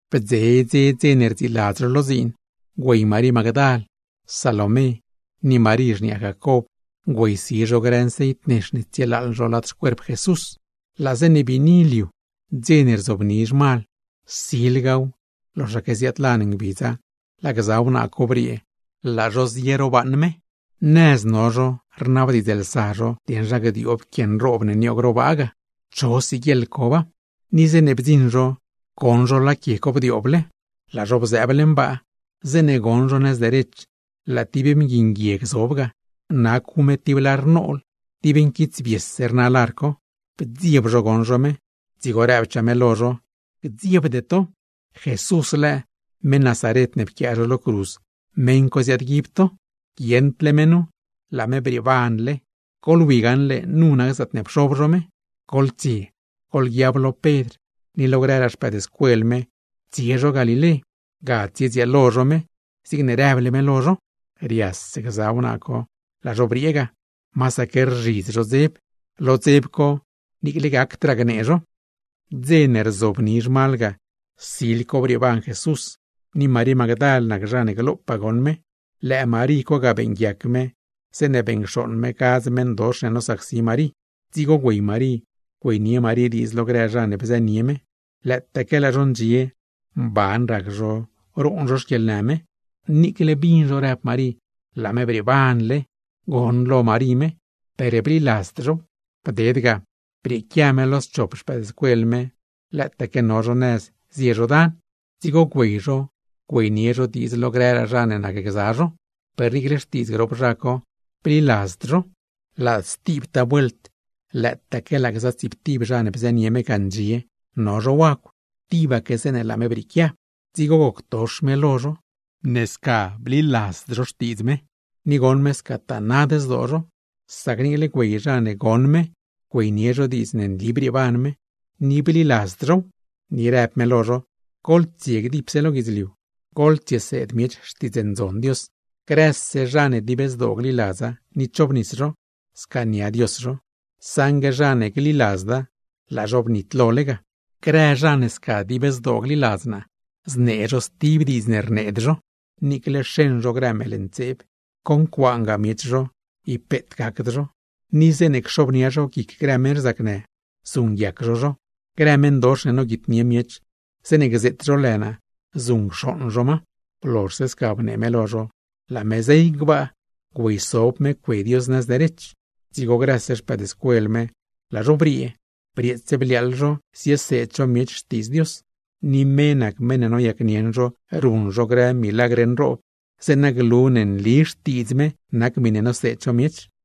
Bdze dze dze ne rdziiladz zho lo dziin, güey Marí Magdal, Salomé, ni Marí xniaa Jacob güeysi zho grë nceit nex ne tsietëëb zho lad xcuerp Jesús. Laa zeeṉe biini liu, dze ne rzobni zhmal, silgaw loxaque ziaadlan ngbidza laa gza wnaa co briee laa zho zie ro baaṉ Jesús. Nëz no zho, rnabdiidzlsa zho dieṉ zha gdioob quie nroob ne nioog ro baa, cho siguieḻ coba. Ni zeeṉe bdziṉ zho, goṉ zho laa quie co bdiooble. Laa zho bzëëb leṉ baa, zeeṉe goṉ zho nëz derech laa tib mgui nguieg zob ga, nacw me tib lar nool, dib nquitsbiese rna lar co. Bdzieb zho goṉ zho me; dzigo rëbchaa me lo zho: ―Gdziebde to. ¿Jesús lëë, meṉ Nazaret ne pquiaa zho lo cruz, meṉ co ziaadguib to? Guieṉdle me nu, ¡laa me brieebanle! Goḻwi gaṉle nu nac zaatne pxob zho me. Goḻtsie, goḻguiab lo Pedr ni lo grëraa xpëëdscuel me tsie zho Galilé, ga tsiedzieel zho me zigne rëble me lo zho glo. Rias gza wnaa co laa zho briee ga, masaque rzhidz zho rdzieb zho. Lo dzeb co ni par gnee zho gacd. [Dze ne rzobni zhmal ga, sil co brieeban Jesús, ni Marí Magdal nac zha ne glopaa goṉ me; lëë Marí co ga beeṉguiac me zeeṉe beṉcxooṉ me gadz meṉdox ne nosacsi Marí. Dzigo güey Marí güeynie Marí diidz lo grë zha ne bzënie me ga. Lëëtaaque laa zho ndxie mban rac zho, roon zho no zho xquieḻnë me. Niicle bin zho rëb Marí laa me brieebanle, goṉlo Marí me; per bliladzd zhow. Bded ga, brieequia me lo schop xpëëdscuel me lëëtaque no zho nëz zie zho dan. Dzigo güey zho güeynie zho diidz lo grëraa zha ne nacgza zho; per niicle xtiidz grop zha co bliladzd zho. Laa stibtaa vuelt, lëëtaque ndziib zho lo mezh no zho wagw gza tsiiptib zho, tibaque zeeṉe laa me brieequia; dzigo goctox me lo zho sac goṉ me ib bliladzd zho xtiidz me; ni goṉ me scataa nad zdoo zho, sac niicle güey zha ne goṉ me güeynie zho diidz ne nli brieeban me, ni bliladzd zhow. Ni rëb me lo zho: ―Goḻtsie dipse lo guidzliu, goḻtsieseed miech Xtiidz Ndzon Dios. Grëse zha ne dib zdoo gliladza ni chobnis zho, scaania Dios zho; saṉgue zha ne gliladzda, laa zho bnitlole ga. Grë zha ne sca dib zdoo gliladz naa: znee zho stib diidz ne rneed zho. Niicle xeṉ zho grë meeḻ ntseeb, concuaangaa miech zho, ib peet gacd zho. Ni zeeṉe cxobnia zho guic grë meṉ rzacnë, zuṉguiac zho zho; grë meṉdox ne noguitnie miech, zeeṉe gzeet zho lë naa zuṉcxooṉ zho ma. Blozhse sca bnee me lo zho, laa me zey gbaa bzob me cue Dios nëz derech. Dzigo grëse xpëëdscuel me laa zho briee, brieets bliaaḻ zho zieseed zho miech Xtiidz Dios. Ni me nac meṉ ne noyacnieṉ zho ruṉ zho grë milagr nroob, zeeṉa glu ne nli Xtiidz me nac miṉe noseed zho miech.]